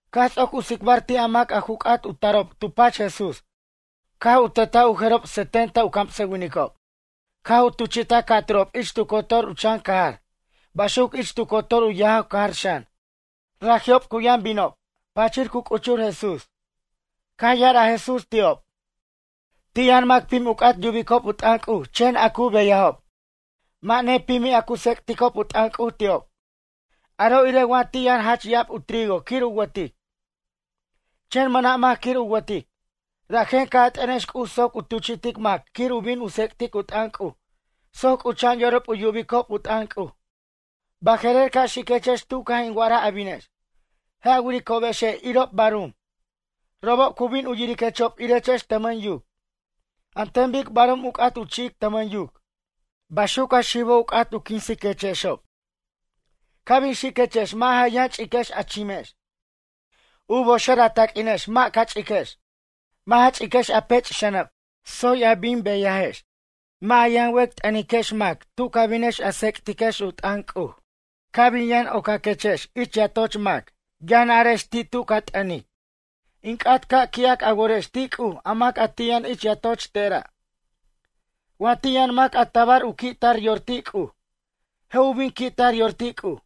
Caj ts'oc u tsicbar ti' a mac a ju c'at u tarob tu pach Jesús caj u tetaj u jerob setenta u camsʌwinicob. Caj u tuchi'taj ca' ca'turob ich tu cotor u chan cajar. Baxuc ich tu cotor u yajaw cajar xan. Raji'ob cu yʌn binob. Pachir cu c'uchur Jesús. Caj ya'araj Jesús ti'ob: ―Ti' yʌn mac pim u c'at yubicob u t'ʌn C'uj chen a cu beyajob, mʌ' nepimi' a cu tsec'ticob u t'ʌn C'uj ti'ob. Aro' irej wa ti' yʌn jach ya'ab u trigo quir u wʌtic. Chen mʌna' mac quir u wʌtic. Rajen ca' a t'ʌnex C'uj soc u tuchi'tic mac quir u bin u tsicbʌtic u t'ʌn C'uj soc c'ucha'an yorob u yubicob u t'ʌn C'uj. Baje'rer ca' xiquechex tu caj in wa'araj a binex. Je' a wiricobexe' irob barum. Robob cu bin yiriquechexob irechex tʌmʌn yuc. An ten bic barum u c'at u chi'ic tʌmʌn yuc. Baxuc a xibo' u c'at quinsiquechexob. Ca' bin xiquechex mʌ' ja yʌn ch'iquex a chimex, u boxer a taq'uinex mʌ' ca ch'iquex. Mʌ' ja ch'iquex a pech' xʌnʌb, ts'ot a bin beyajex. Mʌ' ja yʌn wec' t'ʌniquex mac tu ca binex a tsec'tiquex u t'ʌn C'uj. Ca' bin yʌn ocaquex ich yatoch mac, yʌn arex ti' tu ca t'ʌnic: “In c'at ca' qui'ac a worex ti' C'uj a mac ti' yʌn ich yatoch tera'.” Wa ti' yʌn mac a tabar u qui' tar yor ti' C'uj, je' u bin qui' tar yor ti' C'uj.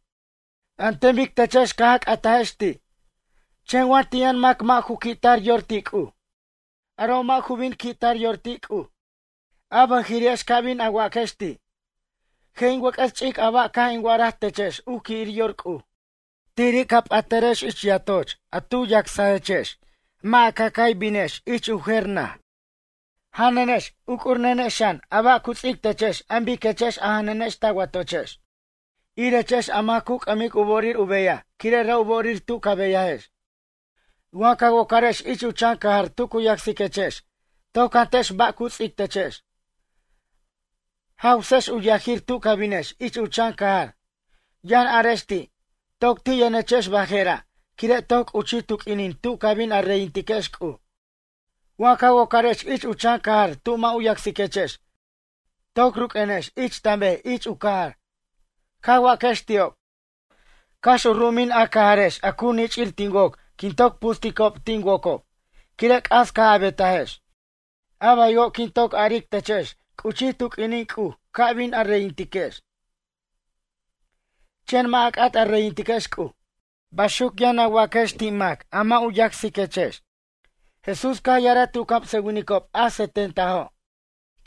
An ten bic techex caj a c'atajex ti'. Chen wa ti' yʌn mac mʌ' u qui'tar yor ti' C'uj. Aro' mʌ' ju bin qui' tar yor ti' C'uj. A bʌjiri'ex ca bin a waquex ti': “Je' in wʌc'ʌs ch'ic a ba' caj in wa'araj techex u qui'ir yor C'uj.” Tiri' ca p'atʌrex ich yatoch a tu yacsechex mʌ' a ca' cay binex ich u jer naj. Janʌnex uc'urnenex xan a ba' cu ts'ic techex an biquex a janʌnex ta watochex. Irechex a mac cu c'ʌmic u bo'orir u beyaj quire' ra' u bo'orir tu ca beyajex. Wa ca wocarex ich u chan cajar tu cu yacsiquechex, toc jantechex ba' cu ts'ictechex. Jawsex u yajir tu ca binex ich u chan cajar. Yʌn arex ti': “Toc ti' yʌnechex baje'ra' quire' toc c'uchij tu q'uinin tu ca bin a reyintiquex C'uj.” Wa ca wocarex ich u chan cajar tu mʌ' u yacsiquex, toc ruq'uenex ich tan bej ich u cajar. Ca waquex ti'ob: “Cax u ru'umin a cajarex a cu nich'ir tin woc quin toc pusticob tin wocob quire' c'as caj a betajex. A baywo' quin toc aric techex c'uchij tu q'uinin C'uj ca' bin a reyintiquex, chen mʌ' a c'at a reyintiquex C'uj.” Baxuc yʌn a waquex ti' mac a mʌ' u yacsiquex. Jesús caj ya'araj ti' u camsʌwinicob a setentajo':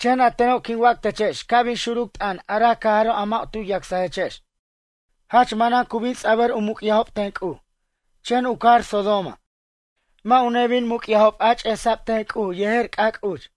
―Chen a teno' quin wac techex ca' bin xuruc t'ʌn a ra cajaro' a mʌ' tu yacsajechex, jach manan cu bin ts'abʌr u muc'yajob ten C'uj. Chen u cajar Sodoma, mʌ' u nebin muc'yajob a ch'esa'b ten C'uj yejer c'ac' uch.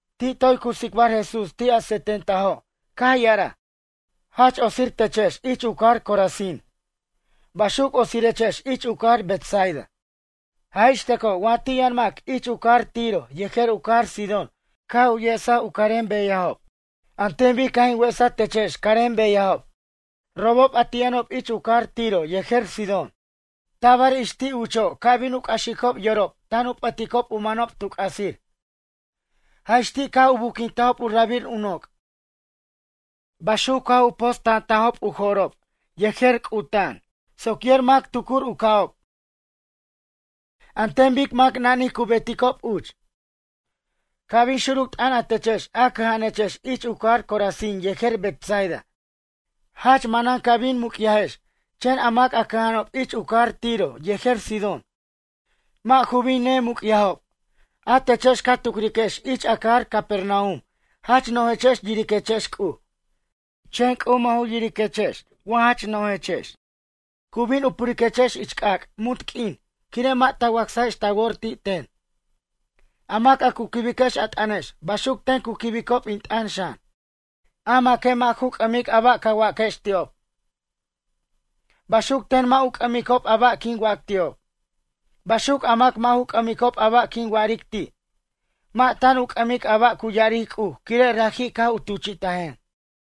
Ti' toy cu tsicbar Jesús ti' a setentajo' caj ya'araj: ―Jach otsir techex ich u cajar Corazín. Baxuc otsirechex ich u cajar Betsaida. Jaj ixtʌco' wa ti' yʌn mac uch ich u cajar Tiro yejer u cajar Sidón caj u yesej u carem beyajob. An ten bic caj in wesaj techex carem beyajob. Robob a ti' yʌnob uch ich u cajar Tiro yejer Sidón. Tabar ix ti' ucho' ca' bin u c'axicob yorob tan a p'ʌticob u manob tu c'asir. Jaj ix ti' caj u buquintajob u rabir u noc'. Baxuc caj u posta'antajob u jo'rob yejer c'uta'an soc yer mac tucur u ca'ob. An ten bic mac nanij cu beticob uch. Ca' bin xuruc t'ʌn a techex a cʌja'anechex ich u cajar Corazín yejer Betsaida. Jach manan ca bin muc'yajex chen a mac a cʌja'anob uch ich u cajar Tiro yejer Sidón, mʌ' ju bin nemuc'yajob. A techex ca tucriquex ich a cajar Capernaum jach no'jechex yiriquechex C'uj. Chen C'uj mʌ' ju yiriquechex wa jach no'jechex cu bin u puriquechex ich c'ac' munt q'uin quire' mʌ' ta wacsajex ta wor ti' ten. ’A mac a cu quibiquex a t'ʌnex baxuc ten cu quibob in t'ʌn xan. A maque' mʌ' ju c'ʌmic a ba' ca waquex ti'ob. Baxuc ten mʌ' u c'ʌmicob a ba' quin wac ti'ob. Baxuc a mac mʌ' ju c'ʌmicob a ba' quin wa'aric ti'. Mʌ' tan u c'ʌmic a ba' cu ya'aric C'uj quire' raji' caj u tuchi'tajen.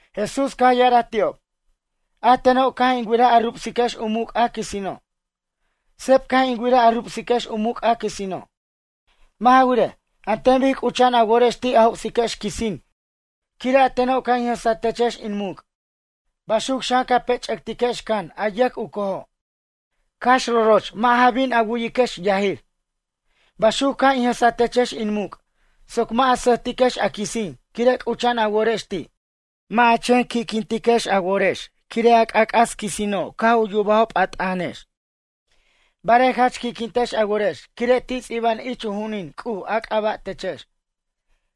Jesús caj ya'araj ti'ob: ―A teno' caj in wiraj a rubsiquex u muc' a quisino'. Seb caj in wiraj a rubsiquex u muc' a quisino'. Mʌ' ja wirej, an ten bic c'ucha'an a worex ti' a joc'siquex quisin quire' a teno' caj in jʌsatechex in muc'. Baxuc xan ca pech'ʌctiquex can a yʌc u cojo', cax roroch mʌ' ja bin a wu'iquex yajir. Baxuc caj in jʌsatechex in muc' soc mʌ' a sʌjtiquex a quisin quire' c'ucha'an a worex ti'. Mʌ' a chen qui'quintex a worex quire' a c'ac'as quisino' caj u yubajob a t'ʌnex, barej jach qui'quintex a worex quire' ti' ts'iba'an ich u ju'unin C'uj a c'aba' techex.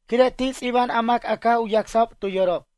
Quire' ti' ts'iba'an a mac a caj u yacsajob tu yorob.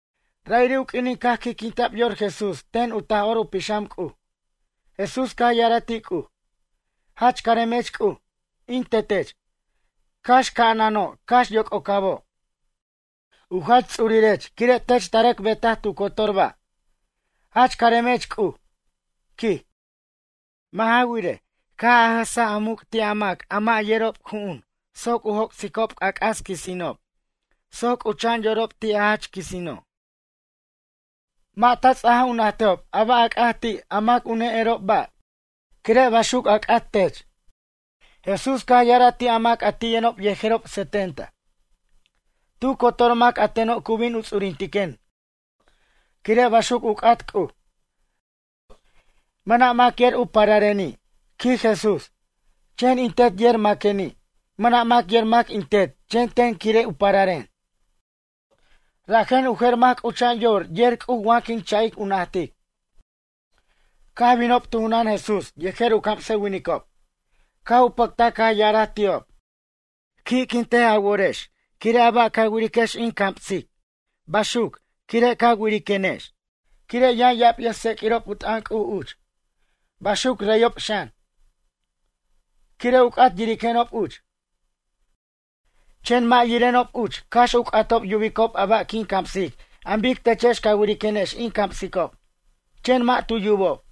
Ra'iri' u q'uinin caj qui'quinta'b yor Jesús ten u Taj'or u Pixam C'uj, Jesús caj ya'araj ti' C'uj: ―Jach caremech C'uj, in tetech, cax ca'anano' cax yoc'ocabo'. U jach ts'urirech quire' tech ta rʌc betaj tu cotor ba'. Jach caremech C'uj ―quij―. Mʌ' ja wirej, caj a jʌsa a muc' ti' a mac a mʌ' yerob ju'un soc u joc'sicob c'ac'as quisinob soc c'ucha'an yorob ti' a jach quisino'. Mʌ' ta ts'aja u najtejob a ba' a c'at ti' a mac u ne'erob ba' quire' baxuc a c'at tech. ’Jesús caj ya'araj ti' a mac ti' yʌnob yejerob setenta. Tu cotor mac a teno' cu bin u ts'urintiquen quire' baxuc u c'at C'uj. Mʌna' mac yer u parareni' ―quij Jesús―, chen in Tet yer maqueni'. Mʌna' mac yer mac in Tet chen ten quire' u pararen. Rajen u jer mac c'ucha'an yor yer C'uj wa quin cha'ic u najtic. Caj binob tu junan Jesús yejer u camsʌwinicob. Caj u pʌctaj caj ya'araj ti'ob: ―Qui'quintej a worex quire' a ba' ca wiriquex in camsic baxuc quire' ca wiriquenex. Quire' yʌn ya'ab yʌjtseq'uirob u t'ʌn C'uj uch. Baxuc reyob xan, quire' u c'at yiriquenob uch, chen mʌ' yirenob uch cax u c'atob yubicob a ba' quin camsic an bic techex ca wiriquenex in camsicob, chen mʌ' tu yubob.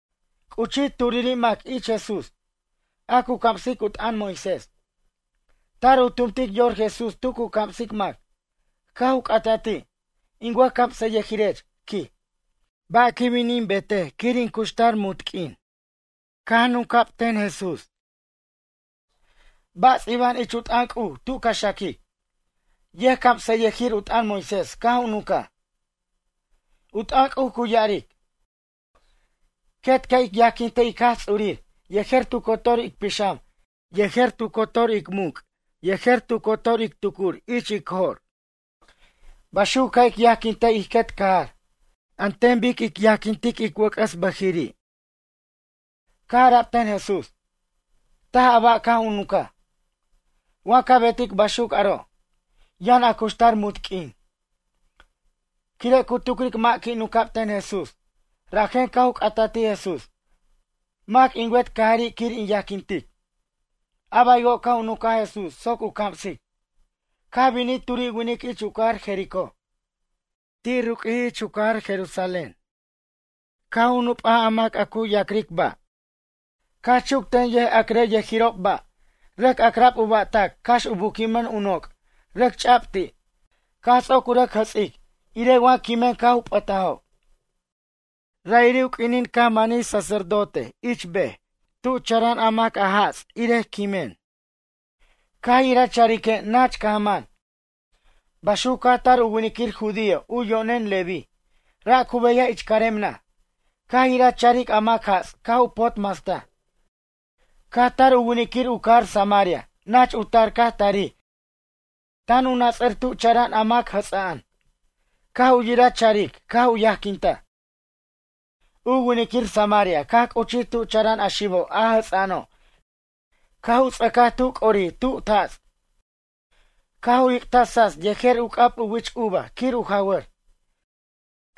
C'uchij turiri' mac ich Jesús. A cu camsic u t'ʌn Moisés. Tar u tumtic yor Jesús tu cu camsic mac. Caj u c'ata ti': ―In wʌjcamsʌyʌjirech ―quij―, ba' quin bin in betej quir in cuxtar munt q'uin? Caj nunca' ten Jesús: ―Ba' ts'iba'an ich u t'ʌn C'uj tu ca xaquic? Yʌjcamsʌyʌjir u t'ʌn Moisés caj u nunca: ―U t'ʌn C'uj cu ya'aric: “Quet ca' ic yajquintej ic Jaj Ts'urir yejer tu cotor ic pixam yejer tu cotor ic muc' yejer tu cotor ic tucur ich ic jo'r.” Baxuc ca' ic yajquintej ij quet cajar. An ten bic ic yajquintic ic wʌc'ʌs bʌjiri'. Caj ara'b ten Jesús: ―Taj a ba' caj a nuncaj. Wa ca betic baxuc aro', yʌn a cuxtar munt q'uin. Quire' cu tucric mʌ' qui' nunc'ab ten Jesús. Rajen ca' u c'ataj ti' Jesús: ―Mac in wet cajari' quir in yajquintic? A baywo' caj u nuncaj Jesús soc u camsic: ―Caj binij turi' winic ich u cajar Jericó. Ti' ruq'uij ich u cajar Jerusalén. Caj u nup'aj mac a cu yac'rʌ' ba'. Caj chuc ten yʌjac'rʌ' yʌjirob ba' rʌc ac'ra'b u ba'tac cax u buquimʌn u noc' rʌc ch'a'b ti', caj ts'oc u rʌj jʌts'ic, irej wa quimen caj u p'ʌtajob. Ra'iri' u q'uinin caj manij sacerdote ich bej tu chara'an a mac jats' irej quimen. Caj yiraj charique' nach caj man. Baxuc caj tar u winiquir judío u yo'nen Leví, ra' cu beyaj ich carem naj. Caj yira charic a mac jats' caj u pot mastaj. Caj tar u winiquir u cajar Samaria nach u tar caj tarij tan u nats'ʌr tu chara'an a mac jʌts'a'an. Caj u yiraj charic caj u yajquintaj. U winiquir samaria caj c'uchij tu chara'an a xibo' a jʌts'a'ano' caj u ts'ʌcaj tu c'orij tut jats' caj u jic'taj tsats yejer u c'ab u wich uva quir u jawʌr.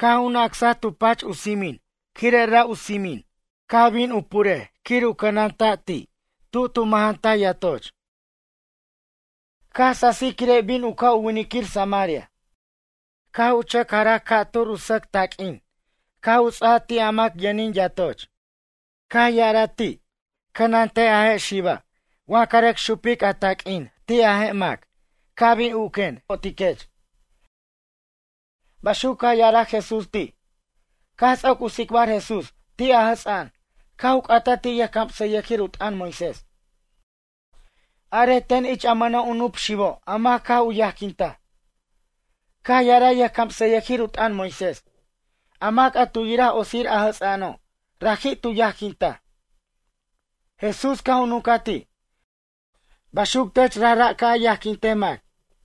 Caj u nacsaj tu pach u tsimin quire' ra' u tsimin caj bin u puric quir u cʌnanta' ti' tu tu mʌjantaj yatoch. Caj sasij quire' bin u ca' u winiquir samaria. Caj u chʌc jaraj u taq'uin ca' turur u sʌc taq'uin caj u ts'aja ti' a mac yʌnin yatoch. Caj ya'araj ti': “Cʌnantej a je' xiba' wa ca rʌc xupic a taq'uin ti' a mac ca' bin uquen je' in bo'otiquech.” Baxuc caj ya'araj Jesús ti'. Caj ts'oc u tsicbar Jesús ti' a jʌts'a'an caj u c'ataj ti' yʌjcamsʌyʌjir u t'ʌn Moisés: ―Arej ten ich a mʌna' u nup xibo' a mac caj u yajquintaj? Caj ya'araj yʌjcamsʌyʌjir u t'ʌn Moisés. A mac a tu yiraj otsir a jʌts'a'ano', raji' tu yajquintaj. Jesús caj u nuncaj ti': ―Baxuc tech rajra' ca' a yajquintej mac.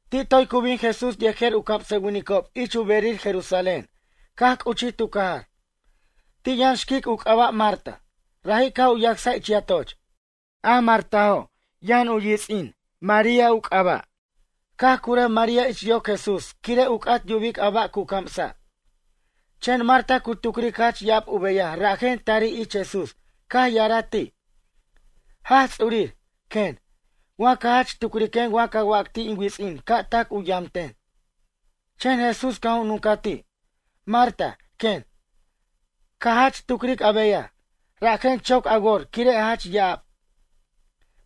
Ti' toy cu bin Jesús yejer u camsʌwinicob ich u berir Jerusalén caj c'uchij tu cajar. Ti' yʌn xquic u c'aba' Marta. Raji' caj u yacsaj ich yatoch. A Martajo' yʌn u yits'in María u c'aba'. Caj curʌj María ich yoc Jesús quire' u c'at yubic a ba' cu camsa'. Chen Marta cu tucric jach ya'ab u beyaj rajen tarij ich Jesús caj ya'araj ti': ―Jaj Ts'urir ―quen―, wa ca jach tucriquen ca wac ti' in wits'in ca' tac u yamten. Chen Jesús caj u nuncaj ti': ―Marta ―quen―, ca jach tucric a beyaj, rajen choc a wor quire' jach ya'ab.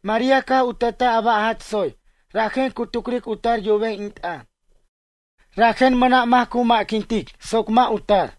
María caj u tetaj a ba' jach tsoy rajen cu tucric u tar yubej in t'ʌn. Rajen mʌna' mac cu ma'quintic soc mʌ' u tar.